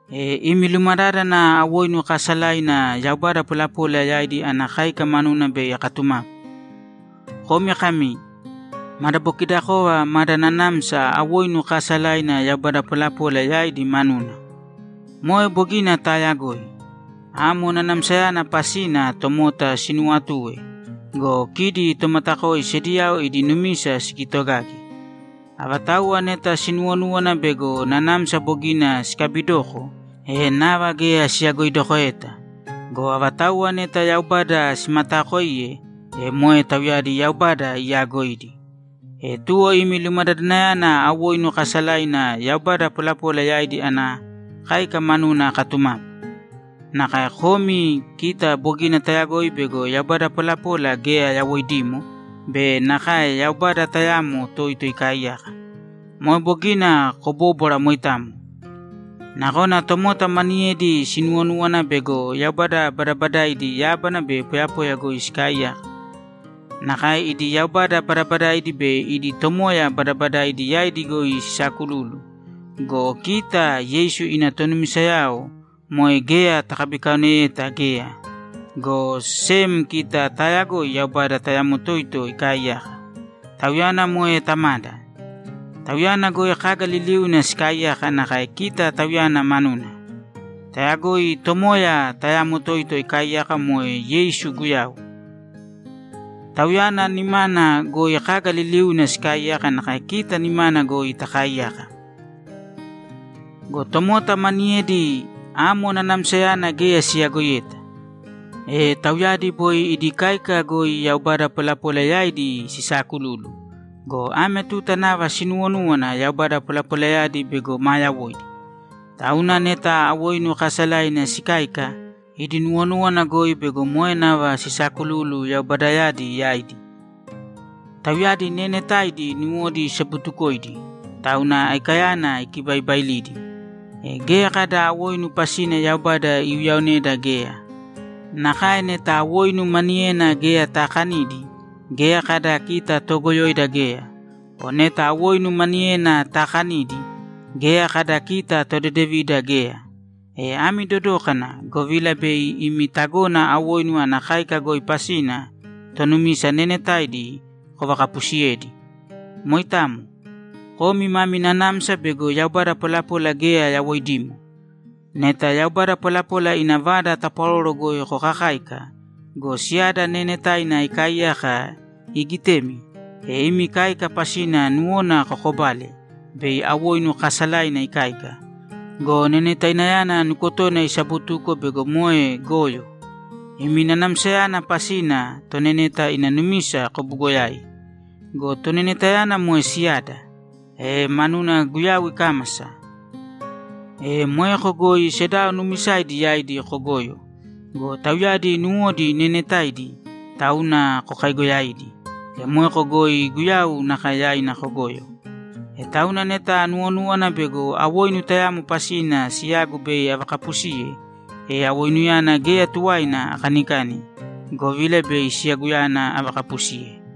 E imi lumadádana awoinu kaasalaina yaubada polapola yaidi ana káika manuna bei akatumapu. Komi kami, ‘Madabokidakova mada nanamsa awoinu kaasalaina yaubada polapola yaidi manuna.’ Moe bogina taayagoi. Amo nanamsayana pasina tomota sinuwatue go, kidi tomatakoi sediyao idi numisa sikitogage. Avatauwa neta sinuwonúwana bego nanamsa bogina sikabidoko, e nava geya siyagoidokoeta. Go avatauwa neta Yaubada simataakoiye, e moe tauyadi Yaubada iyaagoidi. E tuwo imi lumadadanayana awoinu kaasalaina yaubada polapola yaidi ana káika manuna akatumapu. Nakae komi, kita bogina tayagoi bego yaubada polapola geya yawoidimo be nakae Yaubada tayamo toito ikaaiyaka. Moe bogina kobóbwara moitamo. Nakona tomota maniyedi sinuwonúwana bego yaubada badabadaidi yábana be poyapoya goi sikaaiyaka. Nakae idi yaubada badabadaidi be idi tomoya badabadaidi yaidi goi sisakululu go, kita Yeisu ina tonumisayao moe geya takabikaoneyeta geya, go sem kita taayagoi Yaubada tayamo toito ikaaiyaka; Tauyana moe Tamada. Tauyana goi kaga liliuna sikaaiyaka nakae kita Tauyana manuna. Tayagoi Tomoya tayamo toito ikaaiyaka moe Yeisu Guyau. Tauyana nimana goi kaga liliuna sikaaiyaka nakae kita nimana goi takaaiyaka. Go tomota maniyedi, amo nanamsayana geya siyagoiyeta. E tauyadi boi idi káika goi yaubada polapola yaidi sisaakululu go, ame tuta nava sinuwonúwana yaubada polapolayadi bego maa yawoidi. Tauna neta awoinu kaasalaina sikáika, idi nuwonúwana goi bego moe nava sisaakululu yaubadayadi yaidi. Tauyadi neenetaidi nuwodi isabutukoidi, tauna aikayana ikibaibailidi. E geya kada awoinu pasina Yaubada iuyaoneda geya. Nakae neta awoinu maniyena geya taakanidi, geya kada kita toogoyoida geya. O neta awoinu maniyena taakanidi, geya kada kita todedevida geya. E ami dodōkana, govila bei imi tagona awoinu ana káika goi pasina tonumisa neenetaidi kovakapusiyedi. Moitamo. Komi mami nanamsa bego yaubada polapola geya yawoidimo. Neta yaubada polapola ina vada tapwaroro goi kokakáika go, siyada neenetaina ikaaiyaka iigitemi, e imi káika pasina nuwona kokobale bei awoinu kaasalaina ikáika go, nenetainayana nukotona isabutuko bego moe goyo. Imi nanamsayana pasina toneneta ina numisa kobugoyai. Go tonenetayana moe siyada, e manuna Guyau ikámasa! E moeko goi sedao nuumisaidi yaidi kogoyo go, tauyadi nuwodi neenetaidi, tauna kokaigoyaidi, e moeko goi Guyau nakae yaina kogoyo. E tauna neta anuwonúwana bego awoinu tayamo pasina siyagu bei avakapusiye, e awoinuyana geya tuwaina akanikani, govila bei siyaguyana avakapusiye.